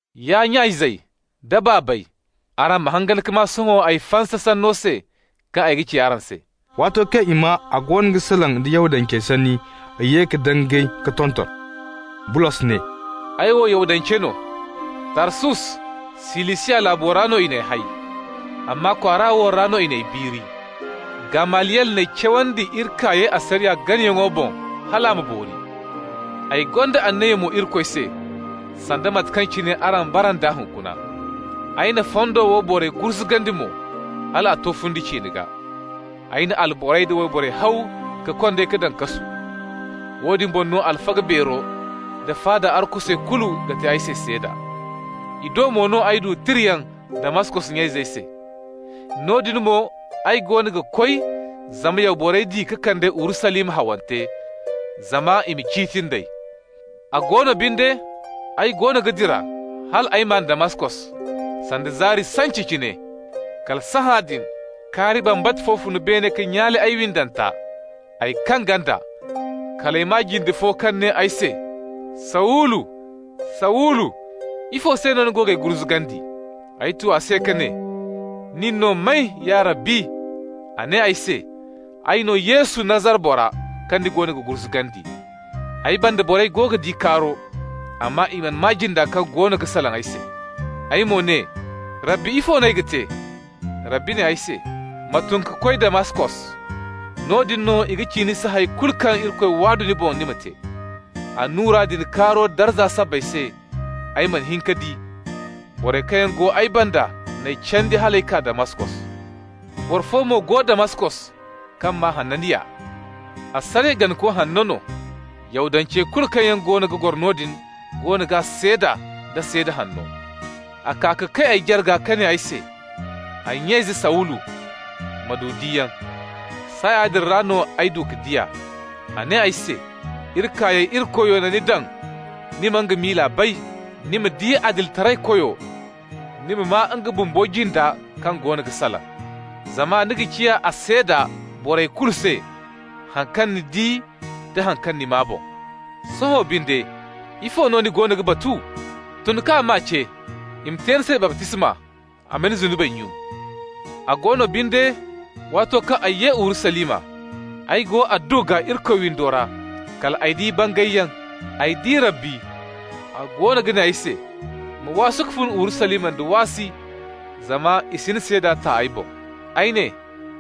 «Ya nya-izey da baabey, araŋ ma hangan ka maa sohõ ay fansa sanno se kaŋ ay ga ci araŋ se.» Waato kaŋ i maa a goono ga salaŋ da Yahudancey sanni, i ye ka dangay ka tonton. Bulos ne: «Ay wo Yahudance no. Tarsus, Silisiya laabo ra no i n'ay hay, amma kwaara wo ra no i n'ay biiri. Gamaliyel n'ay cawandi iri kaayey asariya ganayaŋo boŋ hal a ma boori. Ay gonda anniya mo Irikoy se, sanda mate kaŋ cine araŋ bara nd'a hunkuna. Ay na fondo wo borey gurzugandi mo, hal a to fundi ciine gaa. Ay na alborey da wayborey haw ka kond'ey ka daŋ kasu. Woodin boŋ no alfaga beero da faada arkusey kulu ga te ay se seeda. I do mo no ay du tirayaŋ Damaskos nya-izey se. Noodin mo ay goono ga koy zama ya borey di ka kand'ey Urusalima hawante, zama i ma ciiti nd'ey. A go no binde, ay goono ga dira, hal ay maan Damaskos, sanda zaari sance cine. Kala sahãadin, kaari bambata fo fun beene ka nyaale ay windanta. Ay kaŋ ganda. Kal ay maa jinde fo kaŋ ne ay se: ‹Sawulu, Sawulu, ifo se no ni goono g'ay gurzugandi?› Ay tu a se ka ne: ‹Nin no may, ya Rabbi?› A ne ay se: ‹Ay no Yesu, Nazara bora, kaŋ ni goono ga gurzugandi.› Ay banda borey go ga di kaaro, amma i mana maa jinda kaŋ goono ga salaŋ ay se. Ay mo ne: ‹Rabbi, ifo no ay ga te?› Rabbi ne ay se: ‹Ma tun ka koy Damaskos. Noodin no i ga ci ni se hay kulu kaŋ Irikoy waadu ni boŋ ni ma te.› Annura din kaaro darza sabbay se, ay mana hin ka di. Borey kaŋ go ay banda n'ay candi hal ay kaa Damaskos. Boro fo mo go Damaskos, kaŋ maa Hananiya. Asariya ganako hanno no. Yahudancey kulu kaŋ yaŋ goono ga goro noodin goono g'a seeda nda seeda hanno. A kaa ka kay ay jarga ka ne ay se: ‹Ay nya-ize Sawulu, ma du diyaŋ.› Saaya din ra no ay du ka di a. A ne ay se: ‹Iri kaayey Irikoyo na ni daŋ ni ma nga miila bay, ni ma di Adilitaraykoyo, ni ma maa nga bumbo jinda kaŋ goono ga salaŋ. Zama ni ga ciya a seeda borey kulu se, haŋ kaŋ ni di da haŋ kaŋ ni maa boŋ. Sohõ binde, ifo no ni goono ga batu? Tun k'a maa ce, i ma te ni se baptisma, a ma ni zunubey nyun.› A go no binde, waato kaŋ ay ye Urusalima, ay go adduwa gaa Irikoy windo ra, kal ay di bangayyaŋ. Ay di Rabbi, a goono ga ne ay se: ‹Ma waasu ka fun Urusalima da waasi, zama i si ni seeda ta ay boŋ.› Ay ne: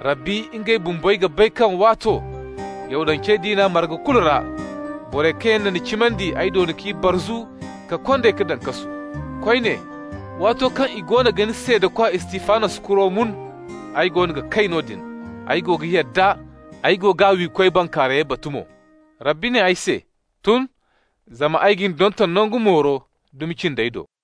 ‹Rabbi, ngey bumbey ga bay kaŋ waato, Yahudance diina marga fu kulu ra, borey kaŋ yaŋ na ni cimandi, ay doona k'i barzu ka kond'ey ka daŋ kasu. Koyne, waato kaŋ i goono ga ni seedakwa Istifanos kuro mun, ay goono ga kay noodin, ay go ga yadda, ay go g'a wiikoy bankaarayey batu mo.› Rabbi ne ay se: ‹Tun, zama ay ga ni donton nangu mooro dumi cindey do.›»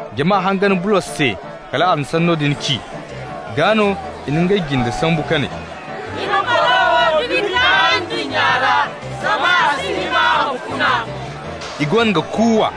Jama hangan Bulos se kal a na sanno din ci, gaa no i na ngey jinde sambu ka ne: «Ni ma boro wo dumi kaa ndunnya ra, zama a si hima a ma funa!» I goono ga kuuwa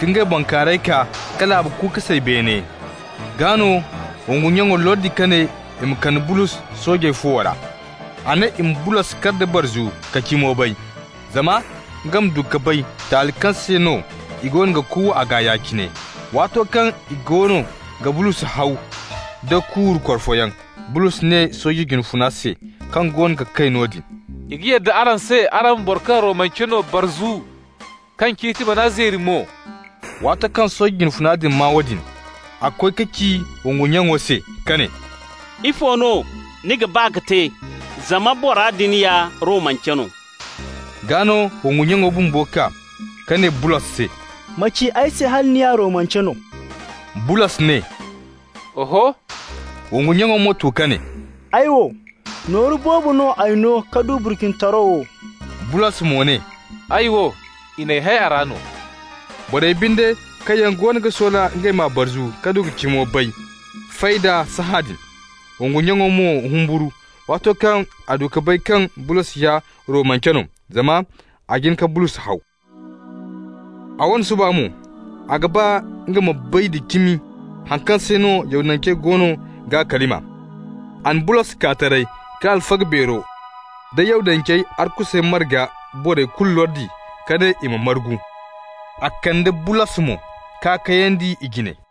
ka ngey bankaarayey kaa ka laabu ku ka say beene. Gaa no wongu nyaŋo lordi ka ne i ma kande Bulos soojey fuwo ra. A ne i ma Bulos kar da barzu ka cimo bay, zama nga ma du ka bay taali kaŋ se no i goono ga kuuwa a gaa ya-cine. Waato kaŋ i goono ga Bulos haw da kuuru korfoyaŋ, Bulos ne sooje jine funa se kaŋ goono ga kay noodin: «I ga yadda araŋ se araŋ ma boro kaŋ Romance no barzu, kaŋ ciiti man'a zeeri mo?» Waato kaŋ sooje jine funa din maa woodin, a koy ka ci wongu nyaŋo se ka ne: «Ifo no ni ga ba ka te? Zama bora din ya Romance no.» Gaa no wongu nyaŋo bumbo kaa ka ne Bulos se: «Ma ci ay se hala ni ya Romance no?» Bulos ne: «Oho.» Wongu nyaŋo mo tu ka ne: «Ay wo, nooru boobo no ay no ka du burcinitaro wo.» Bulos mo ne: «Ay wo, i n'ay hay a ra no.» Borey binde, kaŋ yaŋ goono ga soola ngey m'a barzu ka du ka cimo bay, fay d'a sahãadin. Wongu nyaŋo mo humburu, waato kaŋ a du ka bay kaŋ Bulos ya Romance no, zama a jin ka Bulos haw. A wane suba mo, a ga ba nga ma bay da cimi haŋ kaŋ se no Yahudancey goono g'a kalima. A na Bulos kaa taray ka alfaga beero da Yahudancey arkusey marga borey kulu lordi ka ne i ma margu. A kande Bulos mo k'a kayandi i jine.